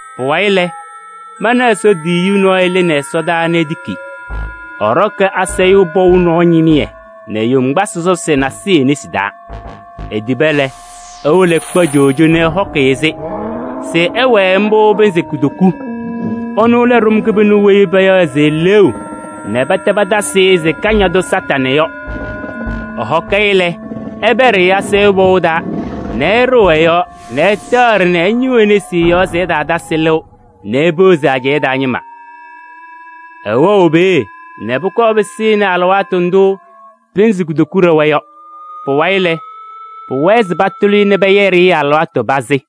Pʋwayɩ lɛ, mana Ɛsɔ tiyiyu nɔɔyʋ lɩnɩ ɛsɔdaa nɛ etiki. Ɛɖɔkɩ asayʋʋ pɔʋ nɔɔ ñɩmɩyɛ nɛ yoŋgbasɩ sɔsɔsɩ nasɩyɩ e-nesi taa. Etiba lɛ, ewolo ɛkpa coojo nɛ ɛhɔkɩ-ɩ-sɩ se ɛwɛɛ mbʋ pɩnzɩ kutoku. Ɛnʋ lɛ ɖʋm kɩbɩnʋ weyi payaɣ se eleeu nɛ pɛtɛ patasɩ-ɩ se Kañadʋ Satanɩ yɔ. Ɛhɔkɩ-ɩ lɛ, ɛpɛɖɩ-ɩ asayʋʋ pɔʋ taa nɛ ɛɖɩɣ ɛ-yɔɔ nɛ ɛtaaɖɩ nɛ ɛñɩɣ nesi ɛ-yɔɔ se ɛtaatasɩ lɩʋ nɛ epeɣzi ajɛɛ taa ñɩma. Ɛwɛɣ peeye nɛ pʋkɔɔ pɩsɩnɩ alɩwaatʋ ndʋ pɩnzɩ kutoku ɖɛwa yɔ. Pʋwayɩ lɛ, pʋwɛɛ se patʋlɩ-ɩ nɛ pɛyɛɖɩ-ɩ alɩwaatʋ pazɩ.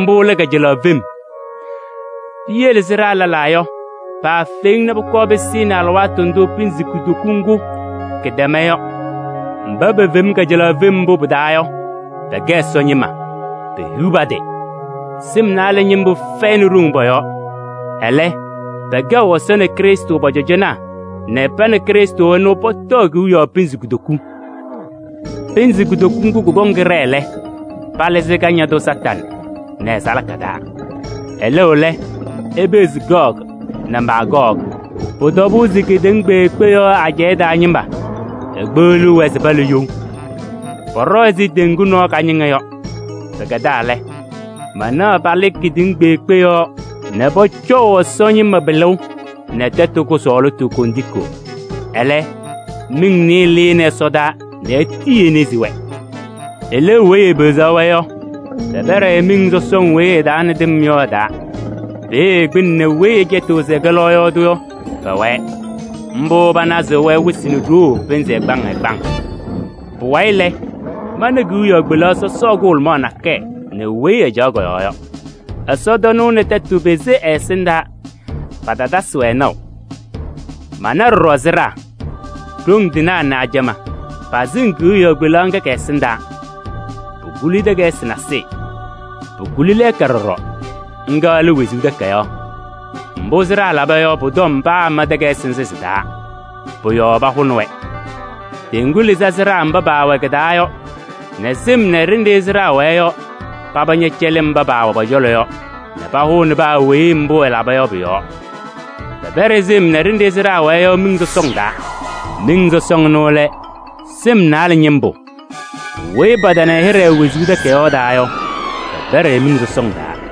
Mbʋ lɛ kajalaɣ fem. Piyele sɩɖaa lɛlaa yɔ, paafeŋ nɛ pʋkɔɔ pɩsɩnɩ alɩwaatʋ ndʋ pɩnzɩ kutoku ŋgʋ kɩtɛma yɔ. Mba pefeŋ kajalaɣ fem mbʋ pɩ-taa yɔ, pɛkɛ Ɛsɔ ñɩma, pehiɣ pa-tɩ! Sɩm naalɛ ñɩmbʋ fɛyɩnɩ ɖoŋ pɔ-yɔɔ. Ɛlɛ, pɛkɛɣ Ɛsɔ nɛ Krɩstʋ pɔ-cɔjɔnaa nɛ pa nɛ Krɩstʋ ɛnʋ, pɔtɔɔ kewiyaɣ pɩnzɩ kutoku. Pɩnzɩ kutoku ŋgʋ kʋkɔŋ kɩɖɛɛ lɛ, palɩzɩ Kañadʋ Satanɩ nɛ ɛ-salaka taa. Ɛlɩɣ lɛ, epeɣzi Gɔɔgɩ nɛ Maagɔɔgɩ, pʋ-tɔbʋʋ se kedeŋa kpeekpe yɔɔ ajɛɛ taa ñɩma. Ekpeɣliɣ-wɛ se pala you. Pɔɖɔ ɛzɩ teŋgu nɔɔ kañɩŋa yɔ. Pɩkɛdaa lɛ, manaɣ palɩ kedeŋa kpeekpe yɔɔ nɛ pɔcɔʋ Ɛsɔ ñɩma pɩlʋʋ nɛ tɛtʋ kʋsɔɔlɩtʋ kondiko. Ɛlɛ, miŋ nɩɩyɩ lɩnɩ ɛsɔdaa nɛ etii enezi-wɛ. Eleeu weyi epeɣzaɣ-wɛ yɔ, pɛpɛɖɩ-ɩ miŋ sɔsɔŋ weyi ɛ-taa nɛ tɩm yɔ ɛ-taa. Peeye kpɩnɛ nɛ weyi ɛcɛtɩɣ se ɛkɛ lɔɔyaɣ tʋ yɔ, pɛwɛɛ. Mbʋ panazɩɣ-wɛ wɩsɩ nɛ ɖoo pɩnzɩ ɛgbaŋ ɛgbaŋ. Pʋwayɩ lɛ, mana kewiyaɣ kpelaɣ sɔsɔɔ kʋhʋlʋmaɣ nakɛyɛ nɛ weyi ɛcaɣ kɔ-yɔɔ yɔ. Ɛsɔtɔnʋʋ nɛ tɛtʋ pese ɛ-ɛsɩndaa, patatasɩ-wɛ naʋ. Mana ɖɔɖɔ sɩɖaa: ɖoŋ tɩnaa nɛ ajamaa pasɩŋ kewiyaɣ kpelaɣ ŋga kɛ-ɛsɩndaa. Pukuli takayɩsɩ nasɩyɩ. Pukuli lɛɛka ɖɔɖɔ, ŋga lɛ wezuu takayaɣ. Mbʋ sɩɖaa laba yɔ, pʋ-tɔm paama takayɩsɩ nzɩ sɩ-taa, pʋ-yɔɔ pahʋnɩ-wɛ. Teŋgu lɩzɩ sɩɖaa mba paawɛ kɩ-taa yɔ nɛ sɩm nɛ ɖenɖe sɩɖaa wɛɛ yɔ, paba ñɛcɛlɩ mba paawɛ pɔ-cɔlɔ yɔ nɛ pahʋnɩ paa weyi mbʋ ɛlaba yɔ pʋ-yɔɔ. Pɛpɛɖɩ sɩm nɛ ɖenɖe sɩɖaa wɛɛ yɔ miŋ sɔsɔŋ taa. Miŋ sɔsɔŋ ɛnʋ lɛ: sɩm naalɛ ñɩmbʋ. Weyi patana ɛ-hɩɖɛ wezuu takayaɣ taa yɔ, pɛpɛɖɩ-ɩ miŋ sɔsɔŋ taa.